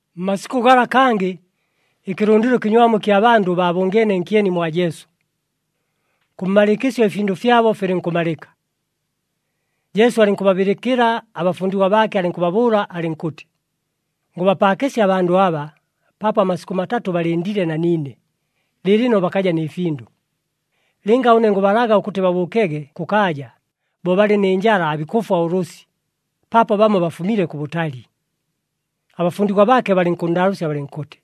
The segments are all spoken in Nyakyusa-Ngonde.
Mmasikʉ gala kangɨ, ɨkɨlʉndɨlo ɨkɨnywamu ɨkya bandʉ baabʉngeene nkyeni mwa Jesu. Kʉ mmalɨɨkɨsyo ɨfindʉ fyabo filɨnkʉmalɨka. Jesu alɨnkʉbabɨlɨkɨla abafundigwa baake, alɨnkʉbabʉʉla alɨnkʉtɨ, “Ngʉbapaakɨsya abandʉ aba, paapo amasikʉ matatʉ balɨndile na niine, lɨɨlɨno bakaja nɨ findʉ. Lɨnga ʉne ngʉbalaga ʉkʉtɨ babʉʉkege kʉkaaja, bo balɨ nɨ njala aabikʉfwa ʉlʉsɨ, paapo bamo bafumile kʉbʉtali.” Abafundigwa baake balɨnkʉnndaalʉʉsya balɨnkʉtɨ,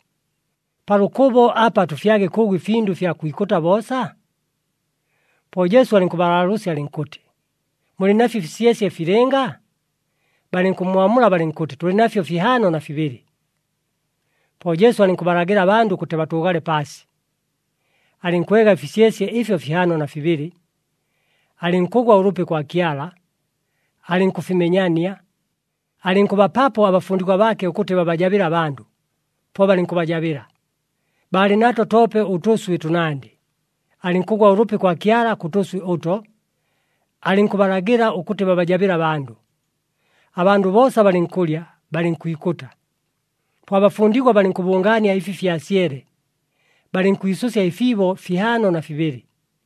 “Pa lʉkʉbo apa tʉfyage kʉʉgʉ ɨfindʉ ɨfya kwikʉta boosa?” Po Jesu alɨnkʉbalaalʉʉsya alɨnkʉtɨ, “Mulɨ nafyo ɨfisyesye filɨnga?” Balɨnkʉmmwamula balɨnkʉtɨ, “Tʉlɨ nafyo fihaano na fibɨlɨ!” Po Jesu alɨnkʉbalagɨla abandʉ ʉkʉtɨ batʉʉgale paasi. Alɨnkwega ɨfisyesye ɨfyo fihaano na fibɨlɨ, alɨnkʉgwa ʉlʉpi kwa Kyala, alɨnkʉfimenyania, alɨnkʉbapapo abafundigwa baake ʉkʉtɨ babajabɨle abandʉ, po balɨnkʉbajabɨla. Baalɨ nato toope ʉtʉswɨ tʉnandɨ. Alɨnkʉgwa ʉlʉpi kwa Kyala kʉ tʉswɨ ʉto, alɨnkʉbalagɨla ʉkʉtɨ babajabɨle abandʉ. Abandʉ boosa balɨnkʉlya, balɨnkwikʉta. Po abafundigwa balɨnkʉbʉngaania ɨfi fyasyele, balɨnkwisʉsya ɨfiibo fihaano na fibɨlɨ.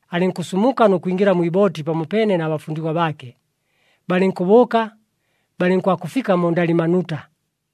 Alɨnkʉsumuka nʉ kwingɨla mwi ibooti pamopeene na bafundigwa baake, balɨnkʉbʉʉka, balɨnkwakʉfika mu Ndalimanuta.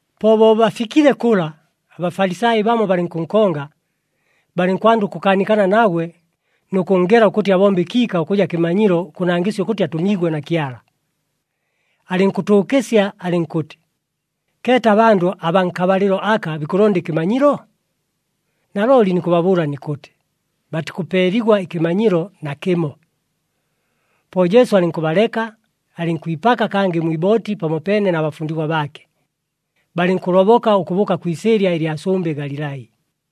Po bo bafikile kʉla, aBafalisai bamo balɨnkʉnkonga. Balɨnkwanda ʉkʉkaanikana nagwe nʉ kʉnngela ʉkʉtɨ abombe ɨkiika ʉkʉja kɨmanyilo ʉkʉnangɨsya ʉkʉtɨ atʉmiigwe na Kyala. Alɨnkʉtʉʉkɨsya alɨnkʉtɨ, “Keeta abandʉ abaa nkabalɨlo aka bikʉlonda ɨkɨmanyilo? Nalooli nikʉbabʉʉla nikʉtɨ, batikʉpeeligwa ɨkɨmanyilo nakɨmo.” Po Jesu alɨnkʉbaleka, alɨnkwipaka kangɨ mwi ibooti pamopeene na bafundigwa baake, balɨnkʉloboka ʉkʉbʉʉka kwi isɨɨlya ɨlya sʉmbɨ Galilai.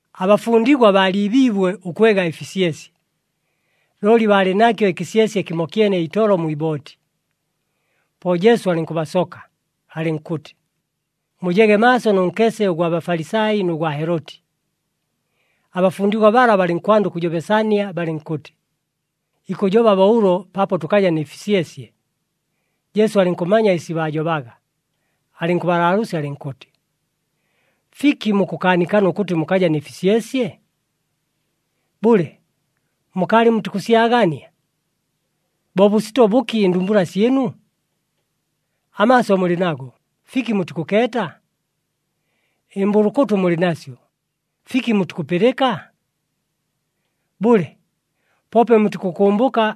Abafundigwa baaliibiibwe ʉkwega ɨfisyesye, looli baalɨ nakyo ɨkɨsyesye kɨmokyene itolo mwi ibooti. Po Jesu alɨnkʉbasoka, alɨnkʉtɨ, “Mujege maaso nʉ nkese ʉgwa Bafalisai nʉ gwa Heloti.” Abafundigwa bala balɨnkwanda ʉkʉjobesania, balɨnkʉtɨ, “Ikʉjoba bo ʉlo paapo tʉkaja nɨ fisyesye.” Jesu alɨnkʉmanya ɨsi baajobaga, alɨnkʉbalaalʉʉsya alɨnkʉtɨ, “Fiki mukʉkaanikana ʉkʉtɨ mukaja nɨ fisyesye? Bʉle, mukaalɨ mutikʉsyagania? Bo bʉsito bʉki ɨndumbula syɨnu? Amaaso mulɨ nago, fiki mutikʉkeeta? Ɨmbʉlʉkʉtʉ mulɨ nasyo, fiki mutikʉpɨlɨka? Bʉle, poope mutikʉkʉmbʉka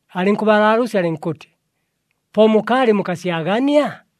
Alɨnkʉbalaalʉʉsya alɨnkʉtɨ, “Po mukaalɨ mukasyagania?”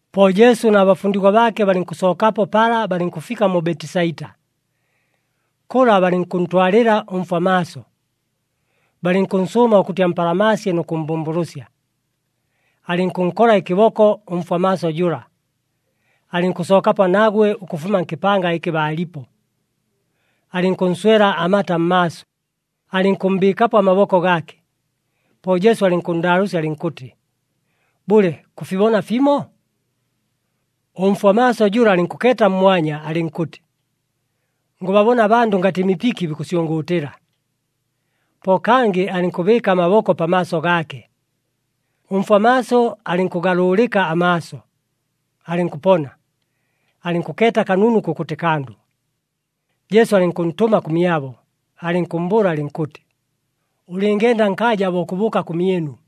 Po Jesu na bafundigwa baake balɨnkʉsookapo pala balɨnkʉfika mu Betisaita. Kʉla balɨnkʉntwalɨla ʉmfwa maaso, balɨnkʉnsʉʉma ʉkʉtɨ ampalamaasye nʉ kʉmmbʉmbʉlʉsya. Alɨnkʉnkola ɨkɨboko ʉmfwa maaso jʉla, alɨnkʉsookapo nagwe ʉkʉfuma nkɨpanga ɨkɨ baalipo. Alɨnkʉnswela amata mmaaso, alɨnkʉmmbɨɨkapo amaboko gaake. Po Jesu alɨnkʉnndaalʉʉsya alɨnkʉtɨ, “Bʉle, kʉfibona fimo?” Ʉmfwa maaso jʉla alɨnkʉkeeta mmwanya, alɨnkʉtɨ, “Ngʉbabona abandʉ ngatɨ mipiki, bikʉsyʉngʉʉtɨla.” Po kangɨ alɨnkʉbɨɨka amaboko pamaaso gaake, ʉmfwa maaso alɨnkʉgalʉʉlɨka amaaso, alɨnkʉpona, alɨnkʉkeeta kanunu kʉkʉtɨ kandʉ. Jesu alɨnkʉntʉma kʉmyabo, alɨnkʉmmbʉʉla alɨnkʉtɨ, “Ʉlɨngenda nkaaja bo kʉbʉʉka kʉmyɨnu.”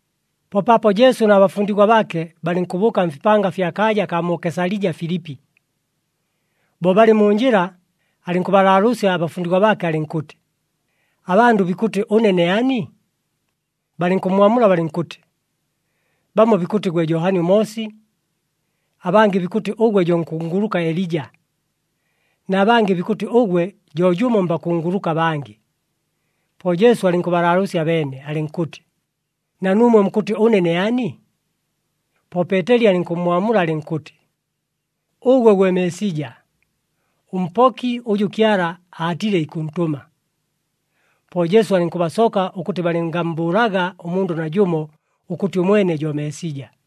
Po paapo Jesu na bafundigwa baake balɨnkʉbʉʉka mfipanga fya kaaja kaa mu Kesalija Filipi. Bo balɨ mu njɨla, alɨnkʉbalaalʉʉsya abafundigwa baake alɨnkʉtɨ, “Abandʉ bikʉtɨ, ʉne ne ani?” Balɨnkʉmmwamula balɨnkʉtɨ, “Bamo bikʉtɨ gwe Johani ʉMoosi, abangɨ bikʉtɨ ʉgwe jo nkunguluka Elija, na bangɨ bikʉtɨ ʉgwe jo jʉmo mbakunguluka abangɨ.” Po Jesu alɨnkʉbalaalʉʉsya abeene, alɨnkʉtɨ, “Na nuumwe mukʉtɨ, ʉne ne ani?” Po Peeteli alɨnkʉmmwamula alɨnkʉtɨ, “Ʉgwe gwe Meesija, ʉMpoki ʉjʉ Kyala aatile ikʉntʉma.” Po Jesu alɨnkʉbasoka ʉkʉtɨ balɨngammbʉʉlaga ʉmundʉ najʉmo, ʉkʉtɨ ʉmwene jo Meesija.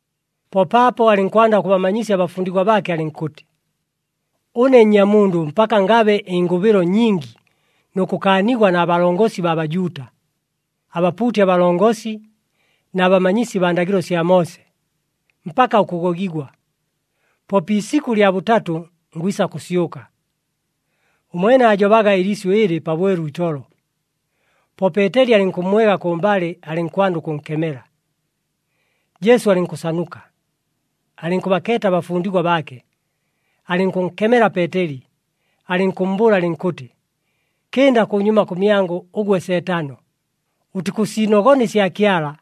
Po paapo alɨnkwanda ʉkʉbamanyisya abafundigwa baake alɨnkʉtɨ, “Ʉne Nnyamundʉ mpaka ngabe ɨngʉbɨlo nyingi nʉ kʉkaanigwa na balongosi baa Bajuuta, abapuuti abalongosi na bamanyisi baa ndagɨlo sya Moose, mpaka ʉkʉgogigwa. Po pi isikʉ lya bʉtatʉ, ngwisa kʉsyʉka.” Ʉmwene aajobaga ɨliisyʉ ɨlɨ pabwelu itolo. Po Peeteli alɨnkʉmmwega kʉmbalɨ, alɨnkwanda ʉkʉnkemela. Jesu alɨnkʉsanuka, alɨnkʉbakeeta abafundigwa baake, alɨnkʉnkemela Peeteli, alɨnkʉmmbʉʉla alɨnkʉtɨ, “Kɨnda kʉnyuma kʉmyangʉ, ʉgwe Seetano! Ʉtikʉsiinogona ɨsya Kyala,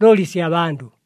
looli ɨsya bandʉ.”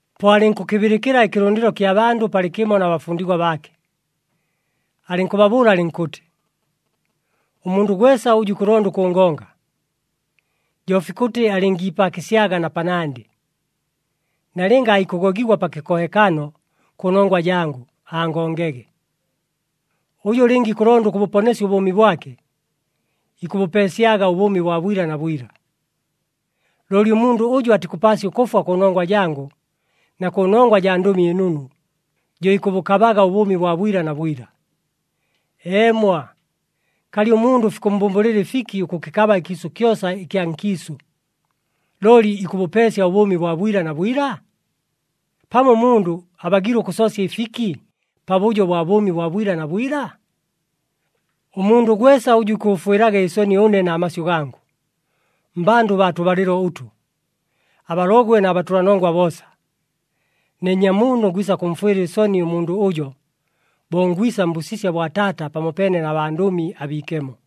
Po alɨnkʉkɨbɨlɨkɨla ɨkɨlʉndɨlo kya bandʉ palɨkɨmo na bafundigwa baake. Alɨnkʉbabʉʉla alɨnkʉtɨ, “Ʉmundʉ gwesa ʉjʉ ikʉlonda ʉkʉngonga, jo fikʉtɨ alɨngiipaakɨsyaga na panandɨ, nalɨnga aikʉgogigwa pa kɨkohekano kʉnongwa jangʉ, angongege. Ʉjʉ lɨnga ikʉlonda ʉkʉbʉponesya ʉbʉʉmi bwake, ikʉbʉpeesyaga ʉbʉʉmi bwa bwila na bwila. Looli ʉmundʉ ʉjʉ atikʉpaasya ʉkʉfwa kʉnongwa jangʉ na kʉnongwa jaa Ndʉmi ɨNunu, jo ikʉbʉkabaga ʉbʉʉmi bwa bwila na bwila. Eemwa, kalɨ ʉmundʉ fikʉmmbʉmbʉlɨla ɨfiki ʉkʉkɨkaba ɨkyʉma kyosa ɨkya nkiisʉ, looli ikʉbʉpeesya ʉbʉʉmi bwa bwila na bwila? Pamo ʉmundʉ abagiile ʉkʉsoosya ɨfiki pabʉjo bwa bʉʉmi bwa bwila na bwila? Ʉmundʉ gwesa ʉjʉ ikʉʉfwɨlaga ɨsoni ʉne na masyʉ gangʉ, mmbandʉ baa tʉbalɨlo ʉtʉ, abalogwe na batʉlanongwa boosa, ne Nnyamundʉ ngwisa kʉmfwɨla ɨsoni ʉmundʉ ʉjo, bo ngwisa mbʉsisya bwa Taata pamopeene na bandʉmi abiikemo.”